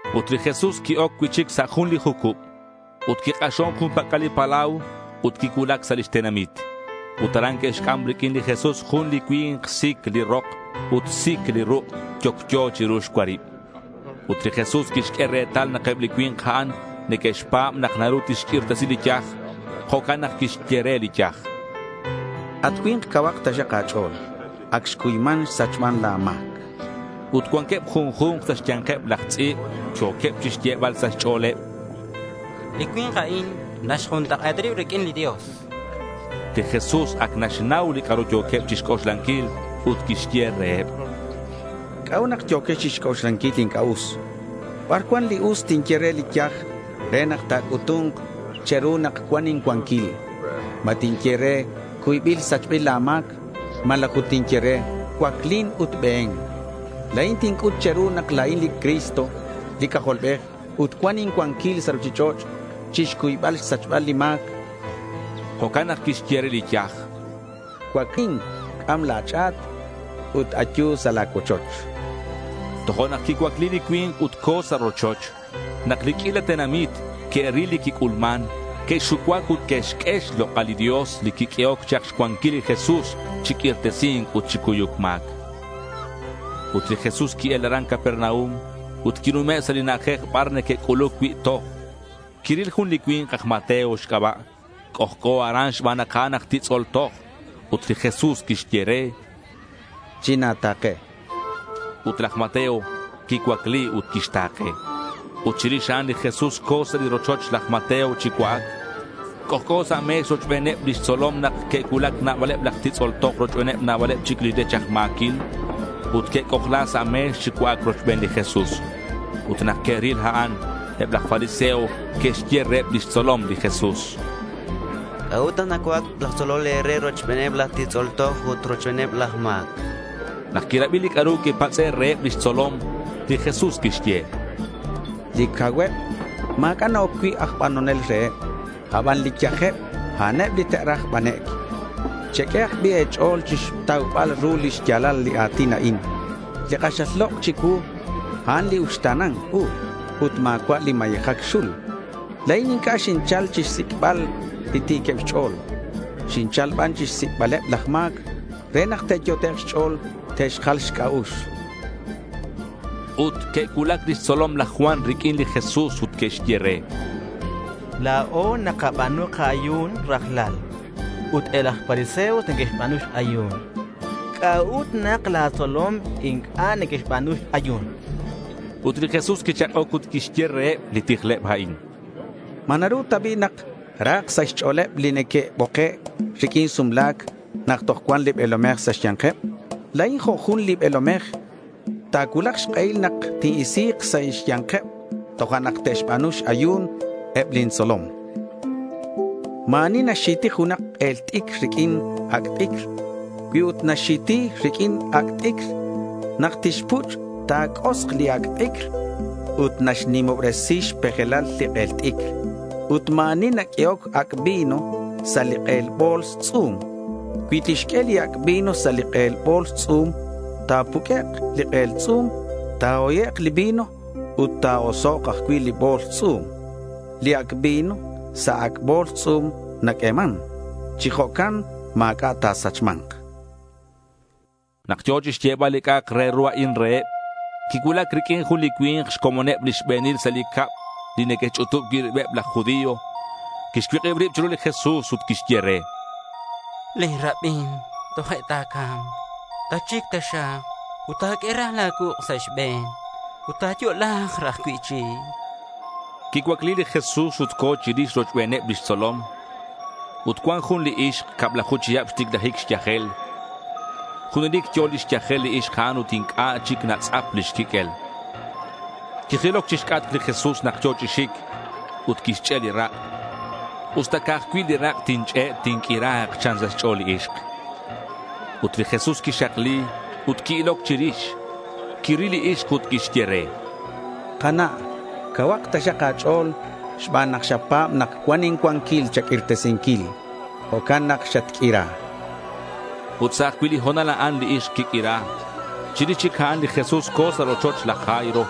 Ut li Jesús qui-oc cui'chic sa' jun li jucub ut quik'axon jun pac'al li palau ut quicuulac sa' lix tenamit. Ut aran que'xc'am riq'uin li Jesús jun li cui̱nk sic li rok ut sic li ruk' yocyo chiru xcuarib. Ut li Jesús quixq'ue retal nak eb li cui̱nk a'an neque'xpa̱b nak naru tixq'uirtesi li yaj. Jo'can nak quixye re li yaj: —At cui̱nk cauhak taxak a̱ch'o̱l. Ac xcuyman xsachman la̱ ma̱c.— Ut cuanqueb junju̱nk sa' xya̱nkeb laj tz'i̱b yo̱queb chixyebal sa' xch'o̱leb: —Li cui̱nk a'in naxjuntak'e̱ta rib riq'uin li Dios, chanqueb. Li Jesús ac naxnau li c'a'ru yo̱queb chixc'oxlanquil ut quixye reheb: —¿C'a'ut nak yo̱quex chixc'oxlanquil li inc'a' us? ¿Bar cuan li us tinye re li yaj re nak ta̱c'utu̱nk che̱ru nak cuan incuanquil? ¿Ma tinye re, “Cuybil sachbil la̱ ma̱c” malaj ut tinye re, “Cuaclin ut be̱n”? La̱in tinc'ut che̱ru nak la̱in li Cristo li C'ajolbej ut cuan incuanquil sa' ruchich'och' chixcuybal xsachbal li ma̱c, chan. Jo'can nak quixye re li yaj: —Cuaclin, c'am la̱ ch'a̱t ut ayu sa' la̱ cuochoch, chan. Tojo'nak quicuacli li cui̱nk ut co̱ sa' rochoch. Nak li q'uila tenamit que'ril li quic'ulman, que'xucuac ut que'xq'ue xlok'al li Dios li quiq'uehoc chak xcuanquil li Jesús chi q'uirtesi̱nc ut chi cuyuc ma̱c. Ut li Jesús qui-el aran Capernaum ut quinume' sa' li na'ajej bar neque'c'uluc cui' toj. Quiril jun li cui̱nk aj Mateo xc'aba'. C'ojc'o aran xban nak a'an aj titz'ol toj. Ut li Jesús quixye re: —China̱ta̱ke.— Ut laj Mateo quicuacli ut quixta̱ke. Ut chirix a'an li Jesús co̱ sa' li rochoch laj Mateo chi cua'ac. C'ojc'o sa' me̱x rochbeneb lix tzolom nak que'cuulac nabaleb laj titz'ol toj rochbeneb nabaleb chic li rech aj ma̱quil. Ut que'c'ojla sa' me̱x chi cua'ac rochben li Jesús. Ut nak que'ril a'an, eb laj fariseo que'xye reheb lix tzolom li Jesús: —¿C'a'ut nak nacua'ac laj tzolol e̱re rochbeneb laj titz'ol toj ut rochbeneb laj ma̱c? chanqueb. Nak quirabi li c'a'ru quipatz'e' reheb lix tzolom, li Jesús quixye: —Li cauheb ma̱c'a' na-oc cui' aj banonel reheb. Aban li yajeb, a'aneb li te'raj banec'. Cheq'uehak bi' e̱ch'o̱l chixtaubal ru li xya̱lal li a̱tin a'in: “li k'axal lok' chicuu, a'an li uxta̱na̱nc u ut ma̱cua' li mayejac xul”. La̱in inc'a' xinchal chixsic'bal li ti̱queb xch'o̱l. Xinchal ban chixsic'baleb laj ma̱c re nak te'yot'ek' xch'o̱l te'xjal xc'a'ux, chan li Jesús. Ut que'cuulac lix tzolom laj Juan riq'uin li Jesús ut que'xye re: —La̱o nakaba̱nu ka-ayu̱n rajlal ut eb laj fariseos neque'xba̱nu x-ayu̱n. ¿C'a'ut nak la̱ tzolom inc'a' neque'xba̱nu x-ayu̱n? chanqueb. Ut li Jesús quichak'oc ut quixye reheb li tijleb a'in: —¿Ma naru ta bi' nak rahak sa' xch'o̱leb li neque'boke' riq'uin sumla̱c nak toj cuan li be̱lomej sa' xya̱nkeb? La̱in jo' jun li be̱lomej. Ta̱cuulak xk'ehil nak tin-isi̱k sa' xya̱nkeb tojo'nak te'xba̱nu x-ayu̱n eb lin tzolom, chan. Ma̱ ani naxxi̱ti junak k'el t'icr riq'uin ac' t'icr. Cui ut naxxi̱ti riq'uin ac' t'icr nak tixpuch', ta̱c'osk li ac' t'icr ut naxnimobresi xpejelal li k'el t'icr. Ut ma̱ ani naq'uehoc ac' vino sa' li k'el bo̱ls tz'u̱m. Cui tixq'ue li ac' vino sa' li k'el bo̱ls tz'u̱m, ta̱puq'uek' li k'el tz'u̱m, ta̱hoyek' li vino, ut ta̱osok' ajcui' li bo̱ls tz'u̱m. Li ac' vino sa' ac' bo̱ls tz'u̱m naq'ueman. Chi jo'can ma̱c'a' nasachman, chan li Jesús. Nak yo̱ chixyebal li c'a'ak re ru a'in reheb, quicuulac riq'uin jun li cui̱nk xcomoneb li xbe̱nil sa' li cab li neque'xch'utub cui' ribeb laj judío. Quixcuik'ib rib chiru li Jesús ut quixye re: —Lin rabin toje' ta̱ca̱mk. Tatxic taxak ut ta̱q'ue raj la̱ cuuk' sa' xbe̱n, ut ta̱yo'la̱k raj cui'chic, chan. Quicuacli li Jesús ut co̱ chirix rochbeneb lix tzolom. Ut cuan jun li ixk cablaju chihab xticlajic xyajel. Junelic yo̱ lix yajel li ixk a'an ut inc'a' chic natz'ap lix quiq'uel. Quijiloc chixc'atk li Jesús nak yo̱ chi xic, ut quixch'e' li rak'. Usta ca'aj cui' li rak' tinch'e', tinq'uira̱k, chan sa' xch'o̱l li ixk. Ut li Jesús quixakli ut qui-iloc chirix. Quiril li ixk ut quixye re: —Kana', cauhak taxak a̱ch'o̱l. Xban nak xapa̱b nak cuan incuanquil cha̱q'uirtesinquil, jo'can nak xatq'uira, chan. Ut sa' ajcui' li ho̱nal a'an, li ixk quiq'uira. Chirix chic a'an li Jesús co̱ sa' rochoch laj Jairo.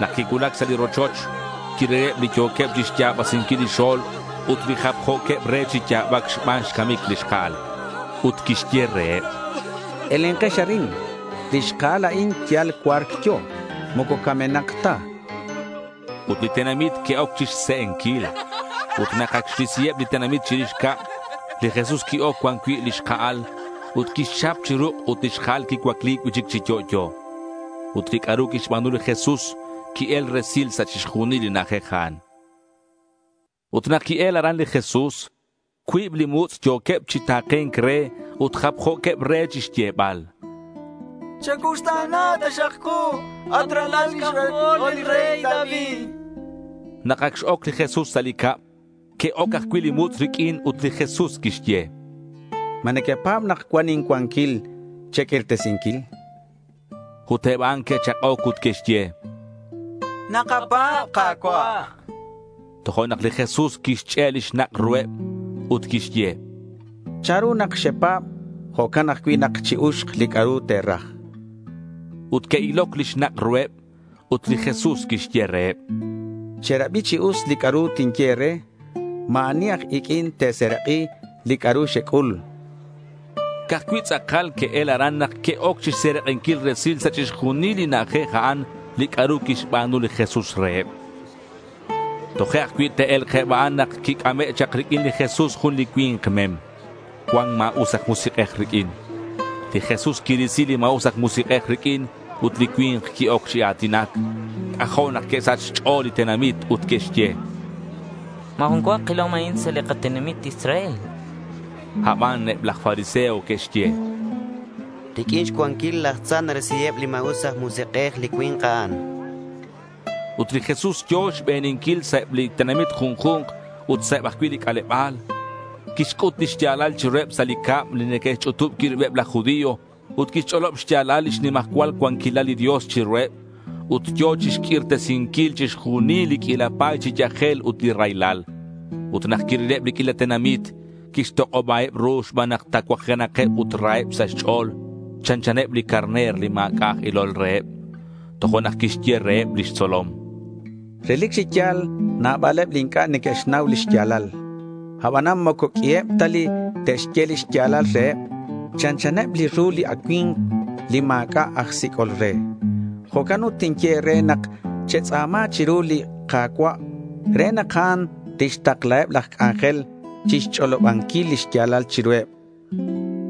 Nak quicuulac sa' li rochoch, quirileb li yo̱queb chixya̱basinquil li xo̱lb ut li japjo̱queb re chi ya̱bac xban xcamic li xka'al. Ut quixye reheb: —Elenkex arin. Li xka'al a'in yal cua̱rc yo̱. Moco camenak ta, chan reheb. Ut li tenamit que'oc chixse'enquil. Ut nak ac xrisiheb li tenamit chirix cab, li Jesús qui-oc cuan cui' li xka'al ut quixchap chi ruk' ut li xka'al quicuacli cui'chic chi yo'yo. Ut li c'a'ru quixba̱nu li Jesús, qui-el resil sa' chixjunil li na'ajej a'an. Ut nak qui-el aran li Jesús, cuib li mutz' yo̱queb chi ta̱ke̱nc re ut japjo̱queb re chixyebal: —Chacuuxta̱na taxak ku, at ralal xc'ajol li rey David.— Nak ac x-oc li Jesús sa' li cab, que'oc ajcui' li mutz' riq'uin ut li Jesús quixye: —¿Ma nequepa̱b nak cuan incuanquil che̱q'uirtesinquil? chan reheb. Ut eb a'an que'chak'oc ut que'xye: —Nakapa̱b, Ka̱cua'.— Tojo'nak li Jesús quixch'e' li xnak' ruheb ut quixye: —Chanru nak xepa̱b, jo'can ajcui' nak chi-uxk li c'a'ru te̱raj.— Ut que'iloc li xnak' ruheb. Ut li Jesús quixye reheb: —Cherabi chi us li c'a'ru tinye e̱re. Ma̱ ani aj iq'uin te̱serak'i li c'a'ru xec'ul, chan reheb. Ca'aj cui' tz'akal que'el aran nak que'oc chixserak'inquil resil sa' chixjunil li na'ajej a'an li c'a'ru quixba̱nu li Jesús reheb. Toje' ajcui' te'e̱lk eb a'an nak quic'ame' chak riq'uin li Jesús jun li cui̱nk mem. Cuan ma̱us aj musik'ej riq'uin. Li Jesús quirisi li ma̱us aj musik'ej riq'uin ut li cui̱nk qui-oc chi a̱tinac. C'ajo' nak que'sach xch'o̱l li tenamit ut que'xye: —Ma̱ jun cua kilom a'in sa' li katenamit Israel.— Aban eb laj fariseo que'xye: —Riq'uin xcuanquil laj tza narisiheb li ma̱us aj musik'ej li cui̱nk a'an, chanqueb. Ut li Jesús yo̱ xbeninquil sa' eb li tenamit junju̱nk ut sa' eb ajcui' li c'aleba̱l. Quixc'ut li xya̱lal chiruheb sa' li cab li neque'xch'utub cui' ribeb laj judío ut quixch'olob xya̱lal lix nimajcual cuanquilal li Dios chiruheb. Ut yo̱ chixq'uirtesinquil chixjunil li q'uila pa̱y chi yajel ut li raylal. Ut nak quirileb li q'uila tenamit, quixtok'obaheb ru xban nak tacuajenakeb ut raheb sa' xch'o̱l. Chanchaneb li carner li ma̱c'a' aj ilol reheb. Tojo'nak quixye reheb lix tzolom, —Relic chi ya̱l nabaleb li inc'a' neque'xnau li xya̱lal. Abanan moco q'uiheb ta li te'xye li xya̱lal reheb. Chanchaneb li ru li acui̱mk li ma̱c'a' aj sic'ol re. Jo'can ut tinye e̱re nak te̱tz'a̱ma chiru li Ka̱cua' re nak a'an tixtaklaheb laj c'anjel chixch'olobanquil li xya̱lal chiruheb, chan li Jesús.